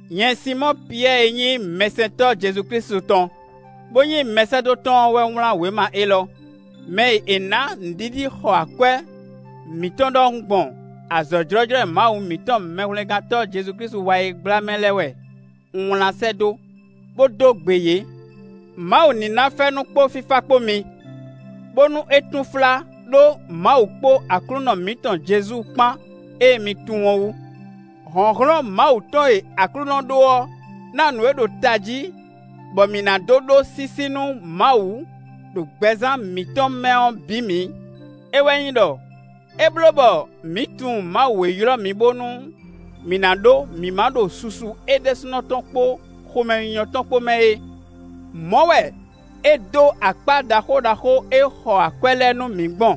Nyɛ Sinmɔ́ɔ Piyɛ́ɛ e nyí mɛsɛntɔ́ Jezu Klísu tɔn, bó nyí mɛsɛ́dó tɔn ɔ́ wɛ wlán wěma élɔ́; mɛ e è nǎ nǔɖiɖi xɔ akwɛ́ mǐtɔn ɖɔhun gbɔn azɔ̌ jlɔ́jlɔ́ e Mawu mǐtɔn Mɛhwlɛ́ngántɔ́ Jezu Klísu wa é gbla mɛ lɛ́ɛ wɛ un wlán sɛ́ dó, bó dó gbe yě. Mawu ní ná fɛ́nú kpó fífá kpó mi, bónú é túnflá ɖó Mawu kpó Aklúnɔ mǐtɔn Jezu kpán e mi tunwun ɔ́ wú. Hlɔ̌nhlɔ́n Mawu tɔn e Aklúnɔ ɖó ɔ́ ná nǔ e ɖo tají bɔ mǐ ná dó ɖó sísí nú Mawu ɖo gbɛzán mǐtɔn mɛ ɔ́ bǐ mǐ; é wɛ nyí ɖɔ: é bló bɔ mǐ tunwun Mawu e ylɔ́ mǐ bónú mǐ ná ɖó mǐmá ɖo susu é ɖésúnɔ tɔn kpó xomɛnyínyɔ́ tɔn kpó mɛ é. Mɔ̌ wɛ é dó akpá ɖaxó ɖaxó e xɔ akwɛ́ lɛ́ɛ nú mǐ gbɔn;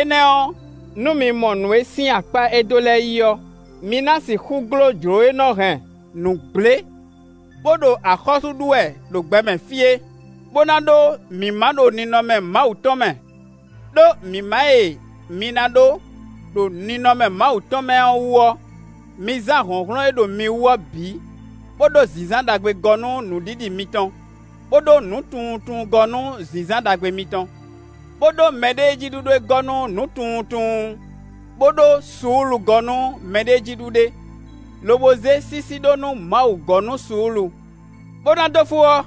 énɛ́ ɔ́, nú mi mɔ nǔ e sín akpá e é dó lɛ́ɛ yí ɔ́, mi ná sixú gló jlǒ e nɔ hɛn nǔ gblé bo ɖo axɔ́sú ɖu wɛ ɖo gbɛmɛ fí é, bó ná ɖó mǐmá ɖo ninɔmɛ Mawu tɔn mɛ. Đó mǐmá e mi ná ɖó ɖo ninɔmɛ Mawu tɔn mɛ ɔ́ wú ɔ́, mi zán hlɔ̌nhlɔ́n e ɖo mi wú ɔ́ bǐ, bó ɖó zǐnzán ɖagbe gɔ́ nú nǔɖiɖi mitɔn, bó ɖó nǔtunwuntunwun gɔ́ nú zǐnzán ɖagbe mitɔn. Bó ɖó mɛɖéejíɖuɖe gɔ́ nú nǔtunwuntunwun, bó ɖó suúlu gɔ́ nú mɛɖéejíɖuɖe, lobo zé sísí ɖó nú Mawu gɔ́ nú suúlu. Bó ná dó fó ɔ́,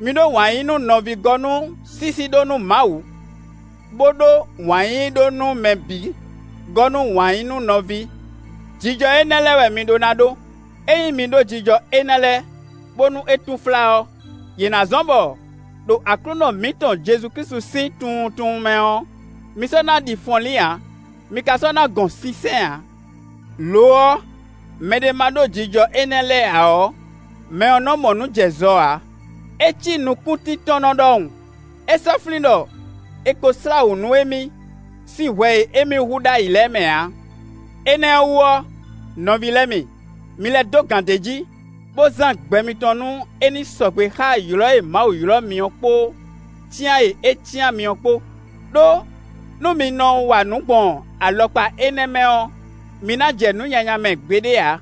mi ɖó wǎn yí nú nɔví gɔ́ nú sísí ɖó nú Mawu, bó ɖó wǎn yíyí ɖó nú mɛ bǐ gɔ́ nú wǎn yí nú nɔví. Jijɔ énɛ́ lɛ́ɛ wɛ mi ɖó ná ɖó; ényí mi ɖó jijɔ énɛ́ lɛ́ɛ bónú é túnflá ɔ́, yě ná zɔ́n bɔ, ɖo Aklúnɔ mǐtɔn Jezu Klísu sín tunwuntunwun mɛ ɔ́, mi sɔ́ ná ɖi fɔnlín ǎ, mi ka sɔ́ ná gɔn sínsɛ́n ǎ. Lo ɔ́, mɛɖé ma ɖó jijɔ énɛ́ lɛ́ɛ ǎ ɔ́, mɛ ɔ́ nɔ mɔ nǔ jɛ zɔ ǎ; é cí nukúntíntɔ́nnɔ ɖɔhun; é sɔ́ flín ɖɔ è ko slá wǔ nú émí sín hwɛ e émí hu ɖ'ayǐ lɛ́ɛ mɛ ǎ. Énɛ́ ɔ́ wú ɔ́, nɔví lɛ́ɛ mi, mi lɛ́ dó gǎn d'é jí, bó zán gbɛ mitɔn nú é ní sɔgbe xá ylɔ̌ e Mawu ylɔ́ mi ɔ́ kpó cyán e é cyán mi ɔ́ kpó; ɖó nú mi nɔ wa nǔ gbɔn alɔkpa énɛ́ mɛ ɔ́, mi ná jɛ nǔ nyanya mɛ gbeɖé ǎ.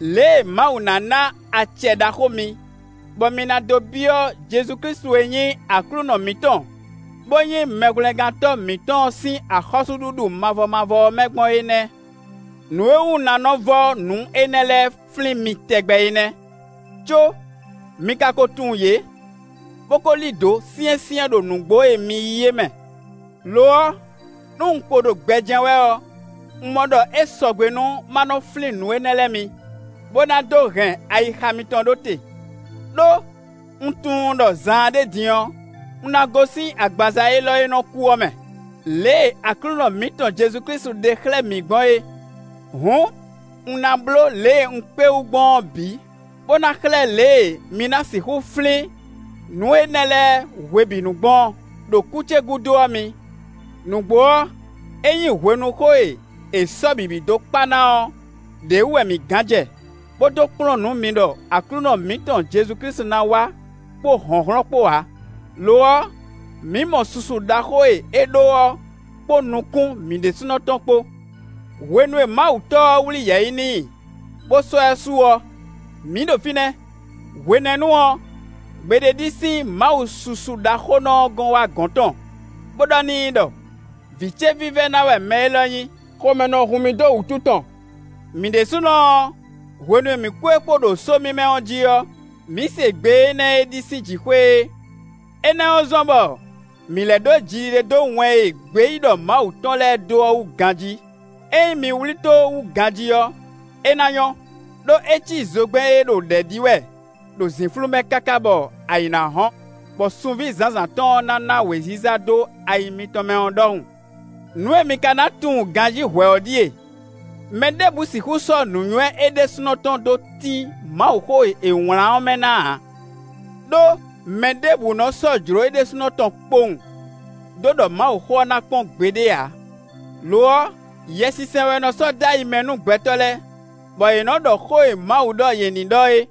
Lě e Mawu ná ná acɛ ɖaxó mi, bɔ mi ná dó byɔ́ Jezu Klísu e nyí Aklúnɔ mǐtɔn, bó nyí Mɛhwlɛ́ngántɔ́ mǐtɔn ɔ́ sín axɔ́súɖuɖu mavɔ mavɔ ɔ́ mɛ gbɔn é nɛ́. Nǔ e wú un ná nɔ vɔ́ nǔ énɛ́ lɛ́ɛ flín mi tɛgbɛ é nɛ́, có mi ka ko tunwun yě, bó ko lí dǒ syɛ́nsyɛ́n ɖo nǔgbó e mi yí é mɛ. Lo ɔ́, nú un kpo ɖo gbɛ jɛ́n wɛ ɔ́, un mɔ ɖɔ é sɔgbe nú ma nɔ flín nǔ énɛ́ lɛ́ɛ mi, bó ná dó hɛn ayixa mitɔn ɖó te. Đó, un tunwun ɖɔ zaanɖé din ɔ́, un ná gosín agbaza élɔ́ e nɔ kú ɔ́ mɛ, lě e Aklúnɔ mǐtɔn Jezu Klísu ɖe xlɛ́ mǐ gbɔn é. Hǔn, un ná bló lě e un kpé wú gbɔn ɔ́ bǐ, bó na xlɛ́ lě e mi ná sixú flín nǔ énɛ́ lɛ́ɛ hwebǐnu gbɔn, ɖo kú ce gúdo ɔ́ mi. Nǔgbó ɔ́, é nyí hwenuxó e è sɔ́ bǐbí dó kpa ná ɔ́ ɖě wú wɛ mǐ gán jɛ, bó dó kplɔ́n nǔ mi ɖɔ Aklúnɔ mǐtɔn Jezu Klísu ná wá kpó hlɔ̌nhlɔ́n kpó ǎ; lo ɔ́, mǐ mɔ susu ɖaxó e é ɖó ɔ́ kpó nukún mǐ ɖésúnɔ tɔn kpó. Hwenu e Mawu Tɔ́ ɔ́ wlí yɛ̌yi n'i, bó sɔ́ ɛ su ɔ́, mǐ ɖo fínɛ́; hwenɛ́nu ɔ́, gbe ɖé ɖi sín Mawu susuɖaxónɔ ɔ́ gɔ́n wá gɔ̌n tɔn, bó ɖɔ n'i ɖɔ: “Vǐ ce vívɛ́ná wɛ mɛ élɔ́ nyí; xomɛ nɔ hun mì dó wǔtu tɔn.” Mǐ ɖésúnɔ ɔ́, hwenu e mǐ kpó é kpó ɖo só mímɛ́ ɔ́ jí ɔ́, mǐ se gbe énɛ́ e ɖi sín jǐxwé é. Énɛ́ ɔ́ zɔ́n bɔ mǐ lɛ́ ɖó jiɖiɖe dó wɛn e gbeyíɖɔ Mawu tɔn lɛ́ɛ dó ɔ́ wú ganjí. Ényí mi wlí tó wú ganjí ɔ́, é ná nyɔ́, ɖó é cí zogbɛ́n e ɖo ɖɛ̌ ɖi wɛ ɖo zǐnflú mɛ káká bɔ ayǐ ná hɔ́n, bɔ sunví zǎnzǎn tɔn ná ná wěziza dó ayi mitɔn mɛ ɔ́ ɖɔhun. Nǔ e mi ka ná tunwun ganjí hwɛ̌ ɔ́ ɖíe: mɛ ɖěbǔ sixú sɔ́ nǔnywɛ́ é ɖésúnɔ tɔn dó tín Mawuxó e è wlǎn ɔ́ mɛ ná ǎ. Đó mɛ ɖěbǔ nɔ sɔ́ jlǒ é ɖésúnɔ tɔn kpowun dó ɖɔ Mawuxó ɔ́ ná kpɔ́n gbeɖé ǎ; lo ɔ́, Yɛsinsɛn wɛ nɔ sɔ́ dó ayi mɛ nú gbɛtɔ́ lɛ́ɛ, bɔ yě nɔ ɖɔ xó e Mawu ɖɔ yě ní ɖɔ é.